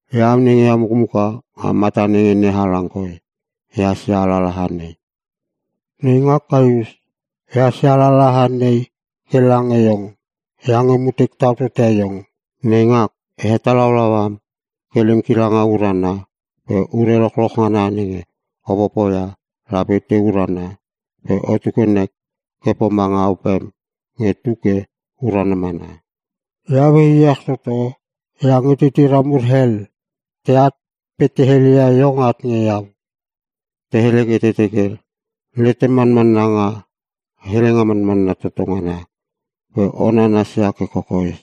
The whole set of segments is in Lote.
Iau nenge iau mukmuka nga mata nenge NeHalang koi ehas ia alalaha nei. Neingak Kaius, ehas ia alalaha nei ke lange iong iange mutek tau tote iong. Neingak, e hetalaulau am ke lem kilanga urana pe ure lochloch ngana nenge o popoia lape te urana pe otu ke nek ke pomanga opem nge tu ke urana mana. Iau e iech toto iange titira mur hel teat pe te heleia iong at nge iau. Te hele ke te teke letem manmanna nga Helenga Manmanna Toto Ngana pe o nanasia ke kokoes.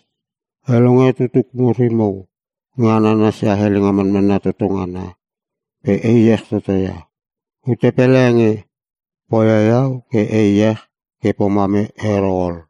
E longe tutuk mur imo nge a nanasia Helenga Manmanna Toto Ngana pe e iech toto ia. Ute pele nge poia iau ke e iech ke pomam ero ol.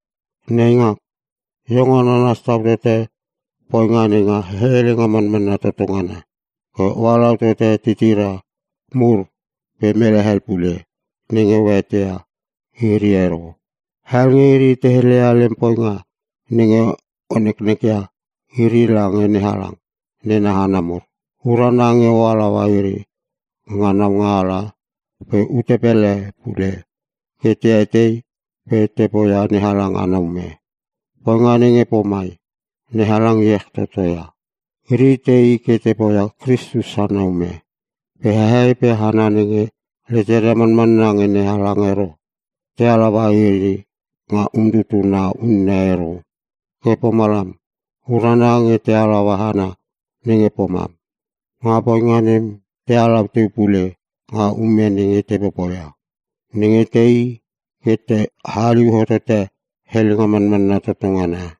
Neingak, iong o nanas tau tote poinga nenga Helenga Manmanna Toto Ngana ke o halau totote titira mur pe mele hel pule nenge o eteia iri ero. Hel nge iri te heleia lem poinga nenge o neknek ia iri lange NeHalang nena hana mur. Urana nge o halaua iri nga ngaunga pe ute hel pule ke tei pe te poia NeHalang ana ume. Poinga nenge pomai NeHalang iech toto ia. Iri tei ke te poia Kristus ana ume pe hehei pe hana nenge leteria manmanna nge NeHalang ero, te halaua iri nga umtutuna unne ero. Ke pomalam urana nge ta halaua hana nenge pomam. Nga poinga nem ta halau teu pule nga ume nenge te popoia, nenge teii ke te haliu hotote Helenga Manmanna Toto Ngana.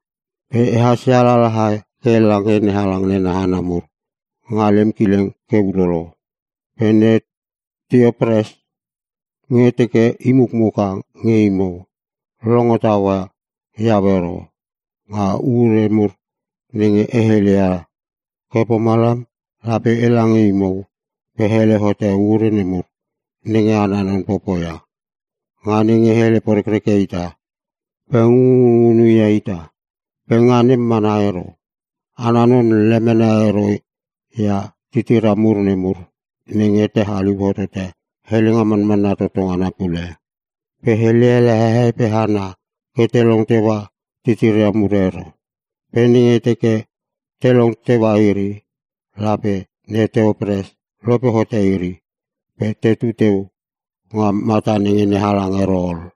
Pe ehas ia alalaha e ke lange NeHalang nena hana mur nga lem kileng ke ulolo. Pe ne Tiotrepes nge teke i mukmuka nge imo, longo taua iau ero nga ure mur nenge e helele ia. Ke pomalam, lape ela nge imo pe e hele hote ure nemur nenge ana non popoia, nga nenge hele porekreke ita pe ngunngunngunu ia ita. Pe nga nem mana ero. Ana non lemene ero ia titira nemur nenge te haliu hotote Helenga Manmanna Toto ngana pule. Pe hele ele hehei pe hana ke te long teua titira nemur ero. Pe nenge teke te long teua iri, lape ne Tiotrepes lope hote iri pe tetu teu nga mata nenge NeHalang ero ol.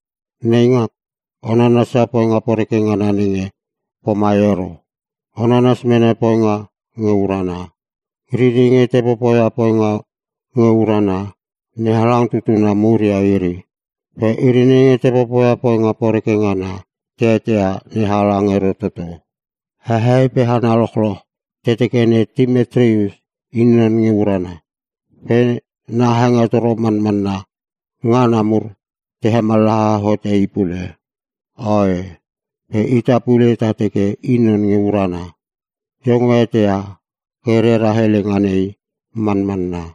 Neingak, o nanasia poinga poreke ngana nenge pomai ero. O nanas mene poinga nge urana. Iri nenge te popoia poinga nge urana NeHalang tutuna mur ia iri. Pe iri nenge te popoi poinga poreke ngana te eteia NeHalang ero toto. Hehei pe hana lochloch te teke Timetrius i non nge urana. Pe na hengetoro manmanna ngana mur te hemallaha hote i pule. Oe, pe ita pule ta teke i non nge urana. Iong o eteia ke rera helenga nei manmanna.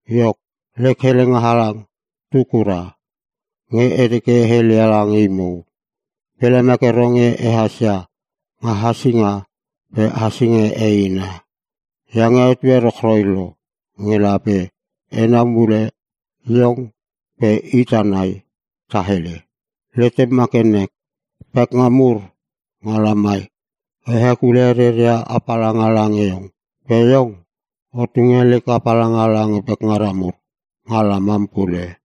Iok, lek helenga halang tetu kura nge e teke e heleia lange imo. Pe lemek ero nge ehas ia nga hasinga pe hasinga eina. Iange etue rochroi lo nge lape enau mule iong pe ita nai ta hele. Letem ma ke nek! Pekngam mur nga lamai te hekule reria apalanga lange iong. Pe iong, o tunge lek apalanga lange pekngara mur nga lamam pule.